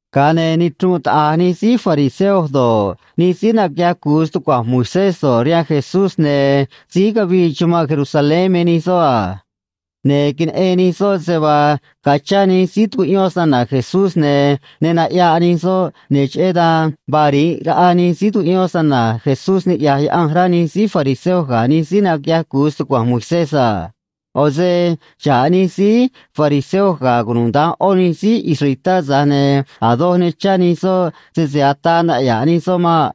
Ga̱a ne̱ nichrunꞌ taꞌa̱j nij síí fariseo do̱ꞌ, nij síí naquiꞌyaj cu̱u stucua̱nj Moisés do̱ꞌ, rihaan Jesús, ne̱ síí cavii chumanꞌ Jerusalén me nij soꞌ a. Ne̱ queneꞌen nij soꞌ se vaa ga̱a chá nij síí tucuꞌyón snana̱ Jesús, ne̱ ne naꞌya̱ꞌ nij soꞌ, ne̱ cheꞌé dan vaa ri̱nꞌ raꞌa nij síí tucuꞌyón snana̱ Jesús niꞌya̱j Yaꞌanj, rá nij síí fariseo ga̱ nij síí naquiꞌyaj cu̱u stucua̱nj Moisés a. ꞌO̱ se xa̱ꞌ nij síí fariseo ga̱ cunuda̱nj ꞌó nij síí israelitá, tza̱j ne̱ a̱ doj ne chá nij soꞌ sese ataa naꞌya̱ꞌ nij soꞌ maꞌ.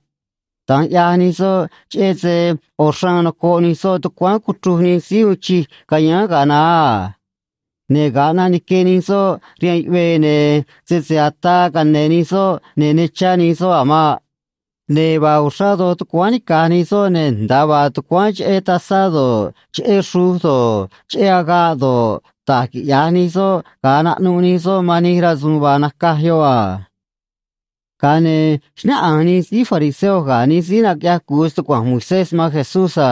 Da̱nj ꞌyaj nij soꞌ, cheꞌé se ꞌo̱ xraan nocoꞌ nij soꞌ tucuáán cuchruj nij síí uun chij cayáán ga̱a naá a. Ne̱ ga̱a ꞌnaꞌ nique nij soꞌ rihaan yuꞌvee, ne̱ sese ataa cane̱ nij soꞌ, ne̱ ne chá nij soꞌ a̱ maꞌ. Ne̱ vaa uxrá doj tucuáán nica̱j nij soꞌ, ne̱ nda̱a vaa tucuáán cheꞌé tazá do̱ꞌ, cheꞌé xruj do̱ꞌ, cheꞌé agaꞌ do̱ꞌ, da̱j quiꞌya̱j nij soꞌ ga̱a naꞌnuꞌ nij soꞌ man nij rasu̱u̱n vaa nacaj yoꞌ a. Ga̱a ne̱ xnáꞌanj nij síí fariseo ga̱ nij síí naquiꞌyaj cu̱u stucua̱nj Moisés man Jesús a: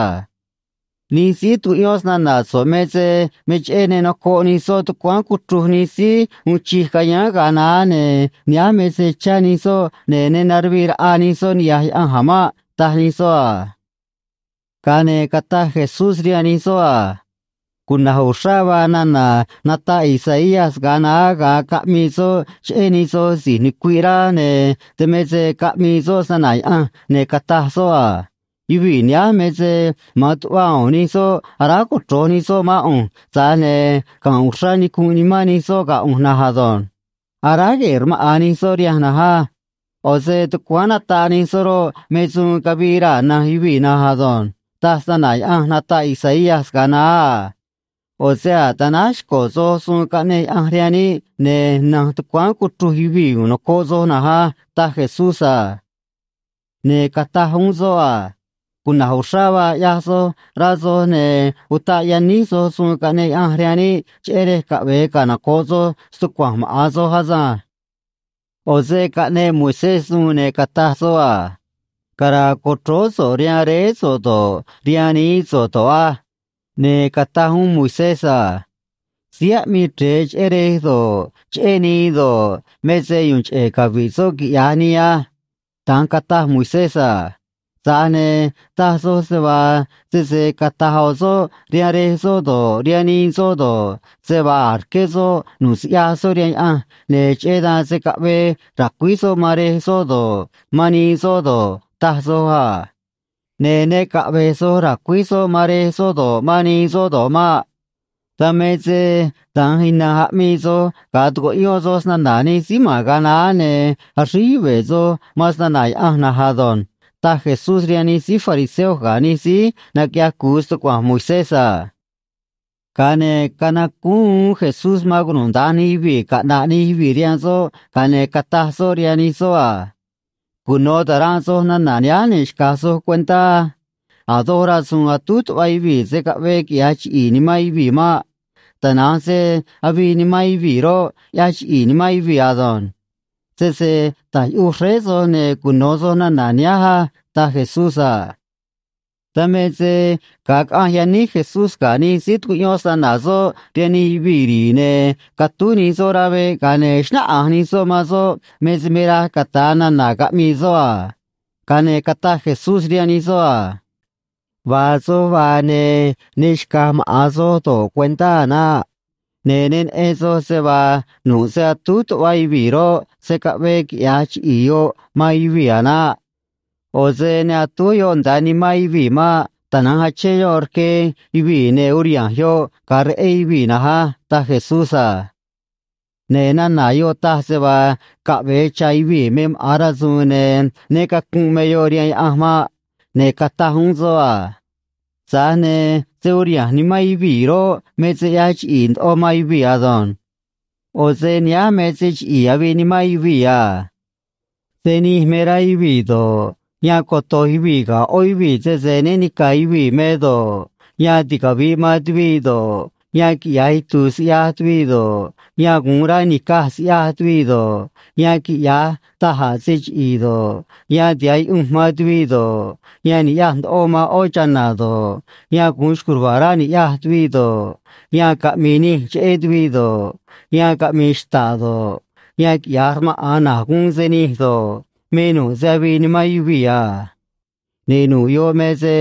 ―Nij síí tucuꞌyón snana̱ so̱ꞌ me se me cheꞌé ne nocoꞌ nij soꞌ tucuáán cuchruj nij síí uun chij cayáán ga̱a naá, ne̱ nihánj me se chá nij soꞌ, ne̱ ne naruvii raꞌa nij soꞌ niꞌya̱j Yaꞌanj a̱ maꞌ ―taj nij soꞌ a. Ga̱a ne̱ cataj Jesús rihaan nij soꞌ a: ―Cuna̱j uxrá vaa nana̱ nataꞌ Isaías ga̱a naá ga̱a caꞌmii soꞌ cheꞌé nij soj si̱j nucuiꞌ rá, ne̱ dan me se caꞌmii soꞌ snana̱ Yaꞌanj, ne̱ cataj soꞌ a: Yuvii̱ nihánj me se ma̱an tuꞌva u̱u̱n nij soꞌ aráj cochro̱j nij soꞌ mán ꞌu̱nj, tza̱j ne̱ ga̱nꞌ uxrá nicunꞌ nimán nij soꞌ ga̱ ꞌu̱nj na̱nj ado̱nj. Aráj gue̱e̱ rmaꞌa̱n nij soꞌ rihanj na̱nj á. ꞌO̱ se tucuáán nataꞌ nij soꞌ roꞌ, me suun cavii raa̱ na̱nj yuvii̱ na̱nj ado̱nj, taj snana̱ Yaꞌanj nataꞌ Isaías ga̱a naá a. ꞌO̱ se a̱j tanáj xco̱ soj suun caꞌneꞌ Yaꞌanj rihaan níꞌ, ne̱ na̱nj tucuáán cuchruj yuvii̱ u̱u̱n nocoꞌ soj na̱nj á ―taj Jesús a. Ne̱ cataj uún soꞌ a: ―Cuna̱j uxrá vaa ꞌyaj soj, rá soj, ne̱ utaꞌ yaníj soj suun caꞌneꞌ Yaꞌanj rihaan níꞌ, cheꞌé rej caꞌve̱e canoco̱ꞌ soj stucua̱nj maꞌa̱n soj asânj. ’ꞌO̱ se caꞌneꞌ Moisés suun ne̱ cataj soꞌ a: “Cara̱a̱ co̱chróó so̱ꞌ rihaan réé so̱ꞌ do̱ꞌ, rihaan nií so̱ꞌ do̱ꞌ á.” Ne̱ cataj uún Moisés a: “Síí aꞌmii chre̱e cheꞌé rej do̱ꞌ, cheꞌé nii do̱ꞌ, me se yu̱u̱n cheꞌe̱ cavi̱ꞌ soꞌ quiꞌya̱j nii á.” Da̱nj cataj Moisés a. Tza̱j ne̱ taj soj se vaa sese cata̱j ꞌo̱ soꞌ rihaan rej soꞌ do̱ꞌ, rihaan nii soꞌ do̱ꞌ, se vaa a̱j rqué soꞌ nu̱ꞌ siꞌyaj soꞌ rihaan Yaꞌanj ne̱ cheꞌé dan se̱ caꞌvee ra̱cuíj soꞌ man rej soꞌ do̱ꞌ, man nii soꞌ do̱ꞌ, taj soj a. Ne̱ ne caꞌve̱j soj ra̱cuíj soꞌ man rej soꞌ do̱ꞌ, man nii soꞌ do̱ꞌ maꞌ. Dan me se da̱nj ina̱nj aꞌmii soj ga̱a tucuꞌyón soj snana̱ nij síí ma̱n ga̱a naá, ne̱ axríj yuve̱ soj man snana̱ Yaꞌanj na̱nj ado̱nj ―taj Jesús rihaan nij síí fariseo ga̱ nij síí naquiꞌyaj cu̱u stucua̱nj Moisés a. Ga̱a ne̱ canacúún uún Jesús man cunuda̱nj nij yuvii̱ caꞌna̱ꞌ nij yuvii̱ rihaan soꞌ, ga̱a ne̱ cataj soꞌ rihaan nij soꞌ a: ―Cuno̱ ta̱ranꞌ soj nana̱ nihánj, ne̱ xca̱j soj cuentá á: A̱ doj rasu̱u̱n atúj tuꞌva yuvii̱ se̱ caꞌvee quiꞌya̱j chiꞌi̱i̱ nimán yuvii̱ maꞌ. Tana̱nj se avii nimán yuvii̱ roꞌ, ꞌyaj chiꞌi̱i̱ nimán yuvii̱ ado̱nj. Sese ta̱j yuꞌuj xréé soj, ne̱ cuno̱ soj nana̱ nihánj á ―taj Jesús a. Dan me se ga̱a caꞌanj yaníj Jesús ga̱ nij síí tucuꞌyón snana̱ soꞌ rihaan nij yuvii̱ ri̱i̱, ne̱ catúj nij soꞌ rá veꞌ, ga̱a ne̱ xnáꞌanj nij soꞌ man soꞌ me se me raj cata̱a nana̱ caꞌmii soꞌ a. Ga̱a ne̱ cataj Jesús rihaan nij soꞌ a: ―Vaa soj vaa, ne̱ ne xca̱j maꞌa̱n soj do̱ꞌ cuentá a̱ naꞌ. Ne̱ ne neꞌen soj se vaa nu̱ꞌ se atúj tuꞌva yuvii̱ roꞌ, se̱ caꞌvee quiꞌya̱j chiꞌi̱i̱ yoꞌ man yuvii̱ a̱ naꞌ. ꞌO̱ se ne atúj yoꞌ nda̱a nimán yuvii̱ maꞌ. Tana̱nj achén yoꞌ rque yuvii̱, ne̱ uriha̱nj yoꞌ ga̱a reꞌé yuvii̱ na̱nj á ―taj Jesús a. Ne̱ nana̱ yoꞌ taj se vaa caꞌve̱e cha̱ yuvii̱ me maꞌa̱n rasu̱u̱n ne̱ né cacunꞌ me yoꞌ rihaan Yaꞌanj maꞌ. Ne̱ cataj uún soꞌ a: ―Tza̱j ne̱ se uriha̱nj nimán yuvii̱ roꞌ, me se ꞌyaj chiꞌi̱i̱ ndoꞌo man yuvii̱ ado̱nj. ꞌO̱ se nihánj me se chiꞌi̱i̱ avii nimán yuvii̱ a. Se nij me rá yuvii̱ do̱ꞌ, yan coto̱j yuvii̱ ga̱ ꞌó yuvii̱ sese né ni̱ca̱ yuvii̱ me do̱ꞌ, yan ticavi̱ꞌ man tuviꞌ do̱ꞌ, yan quiꞌya̱j itu̱u̱ siꞌyaj tuviꞌ do̱ꞌ, yan gu̱un rá ni̱caj siꞌyaj tuviꞌ do̱ꞌ, yan quiꞌya̱j da̱j a̱ se chiꞌi̱i̱ do̱ꞌ, yan tiha̱ꞌ yuꞌunj man tuviꞌ do̱ꞌ, yan ni̱ꞌyaj ndoꞌo man ꞌó chana̱ do̱ꞌ, yan gu̱un xco̱j ruva̱a̱ rá ni̱ꞌyaj tuviꞌ do̱ꞌ, yan caꞌmi̱i̱ nij cheꞌé tuviꞌ do̱ꞌ, yan caꞌmi̱i̱ xta̱ꞌ do̱ꞌ, yan quiꞌya̱j rmaꞌa̱n na̱j guun se nij do̱ꞌ, me nu̱ꞌ se avii nimán yuvii̱ a. Ne̱ nu̱ꞌ yoꞌ me se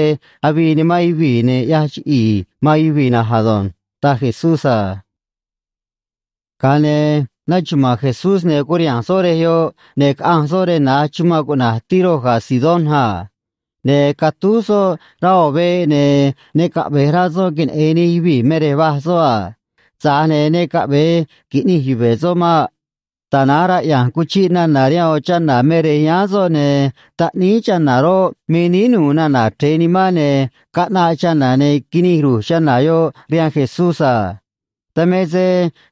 avii nimán yuvii̱ ne̱ ꞌyaj chiꞌi̱i̱ man yuvii̱ na̱nj ado̱nj ―taj Jesús a. Ga̱a ne̱ naxuma̱a̱n Jesús, ne̱ curiha̱nj soꞌ rej yoꞌ, ne̱ caꞌanj soꞌ rej na̱j chumanꞌ cuꞌna̱j Tiro ga̱ Sidón a. Ne̱ catúj soꞌ rá ꞌo̱ veꞌ, ne̱ ne caꞌve̱j rá soꞌ queneꞌe̱n nij yuvii̱ me rej vaj soꞌ a. Tza̱j ne̱ ne caꞌve̱e qui̱ꞌnij yuve̱ soꞌ maꞌ. Tana̱nj raꞌya̱nj cuchiꞌ nana̱ rihaan ꞌo̱ chana̱ me rej yáán soꞌ, ne̱ taꞌníí chana̱ roꞌ, me níí nu̱u̱ nana̱ chre̱e nimán, ne̱ caꞌnaꞌ chana̱, ne̱ quinij ru̱j chana̱ yoꞌ rihaan Jesús a. Dan me se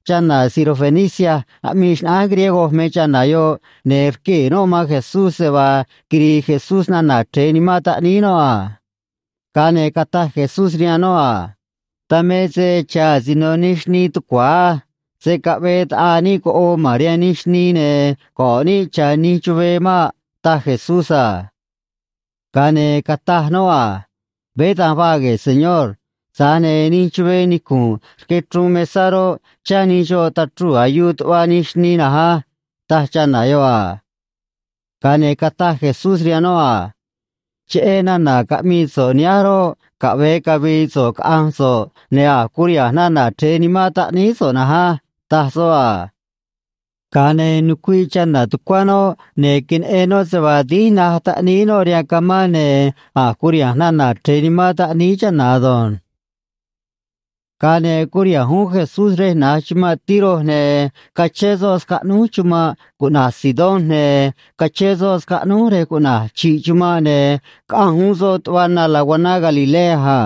chana̱ sirofenicia aꞌmii xnaꞌánj griego me chana̱ yoꞌ, ne̱ rquee̱ noꞌ man Jesús se vaa quiri̱i̱ Jesús nana̱ chre̱e nimán taꞌníí noꞌ a. Ga̱a ne̱ cataj Jesús rihaan noꞌ a: ―Dan me se cha̱ asino nij xnii tucua̱ á. Se̱ caꞌvee ta̱ꞌaa níꞌ coꞌoo ma̱n rihaan nij xnii ne̱ go̱ꞌ níꞌ cha̱ nij chuvee maꞌ ―taj Jesús a. Ga̱a ne̱ cataj noꞌ a: ―Veé da̱nj vaa gue̱e̱, Señor. Tza̱j ne̱ nij chuvee nicu̱nꞌ rque chruun mesá roꞌ, chá nij xoꞌ tachruu̱ ayuu tuꞌva nij xnii na̱nj á ―taj chana̱ yoꞌ a. Ga̱a ne̱ cataj Jesús rihaan noꞌ a: ―Cheꞌé nana̱ caꞌmii so̱ꞌ nihánj roꞌ, caꞌve̱e cavi̱i̱ so̱ꞌ caꞌa̱nj so̱ꞌ, ne̱ a̱j curiha̱nj nana̱ chre̱e nimán taꞌníí so̱ꞌ na̱nj á ―taj soꞌ a. Ga̱a ne̱ nucuiꞌ chana̱ tucuá noꞌ, ne̱ queneꞌen noꞌ se vaa dínj naj taꞌníí noꞌ rihaan camá, ne̱ a̱j curiha̱nj nana̱ chre̱e nimán taꞌníí chana̱ ado̱nj. Ga̱a ne̱ curiha̱nj uún Jesús rej na̱j chumanꞌ Tiro, ne̱ cachén soꞌ scaꞌnúj chumanꞌ cuꞌna̱j Sidón, ne̱ cachén soꞌ scaꞌnúj rej cuꞌna̱j Chi̱ꞌ Chumanꞌ, ne̱ caꞌanj uún soꞌ tuꞌva na laguaná Galilea a.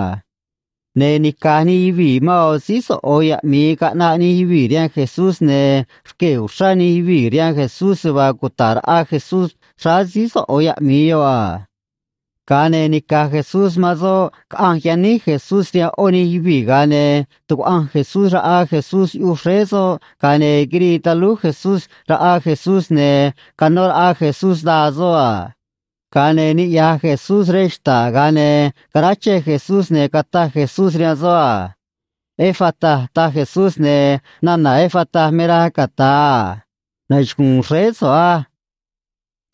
Ne̱ nica̱j nij yuvii̱ man ꞌo̱ síí soꞌo̱ yaꞌmi̱i caꞌnaꞌ nij yuvii̱ rihaan Jesús, ne̱ rquee̱ uxrá nij yuvii̱ rihaan Jesús se vaa cuta̱ꞌ raꞌa Jesús xráá síí soꞌo̱ yaꞌmi̱i yoꞌ a. Ga̱a ne̱ nica̱j Jesús man soꞌ caꞌanj yaníj Jesús rihaan ꞌó nij yuvii̱, ga̱a ne̱ tucuaꞌanj Jesús raꞌa Jesús yuꞌuj xréé soꞌ, ga̱a ne̱ quirii talúj Jesús raꞌa Jesús, ne̱ canó raꞌa Jesús daa soꞌ a. Ga̱a ne̱ niꞌya̱j Jesús rej xta̱ꞌ, ga̱a ne̱ caráchej Jesús, ne̱ cataj Jesús rihaan soꞌ a: ―Efata ―taj Jesús, ne̱ nana̱ Efata me raj cata̱a a: Nachugu̱u̱n xréé so̱ꞌ á.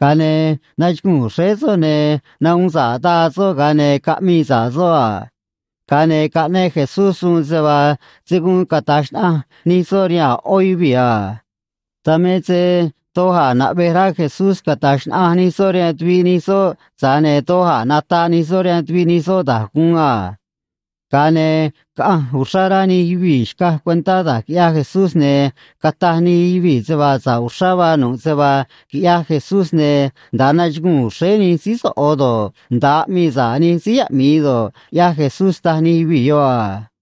Ga̱a ne̱ nachuguu̱n xréé soꞌ, ne̱ nahuun sa̱ꞌ daa soꞌ, ga̱a ne̱ caꞌmii sa̱ꞌ soꞌ a. Ga̱a ne̱ caꞌneꞌ Jesús suun se vaa se̱ guun cata̱j xnaꞌanj nij soꞌ rihaan a̱ ꞌó yuvii̱ a. Dan me se doj a̱ naꞌvej rá Jesús cata̱j xnaꞌanj nij soꞌ rihaan tuviꞌ nij soꞌ, tza̱j ne̱ doj a̱ nataꞌ nij soꞌ rihaan tuviꞌ nij soꞌ da̱j guun a. Ga̱a ne̱ caꞌanj uxrá rá nij yuvii̱ xcaj cuentá da̱j quiꞌyaj Jesús, ne̱ cataj nij yuvii̱ se vaa sa̱ꞌ uxrá vaa nu̱ꞌ se vaa quiꞌyaj Jesús, ne̱ nda̱a nachuguu̱n xréé nij síí soꞌo̱ do̱ꞌ, nda̱a aꞌmii sa̱ꞌ nij síí yaꞌmi̱i do̱ꞌ, ꞌyaj Jesús, taj nij yuvii̱ yoꞌ a.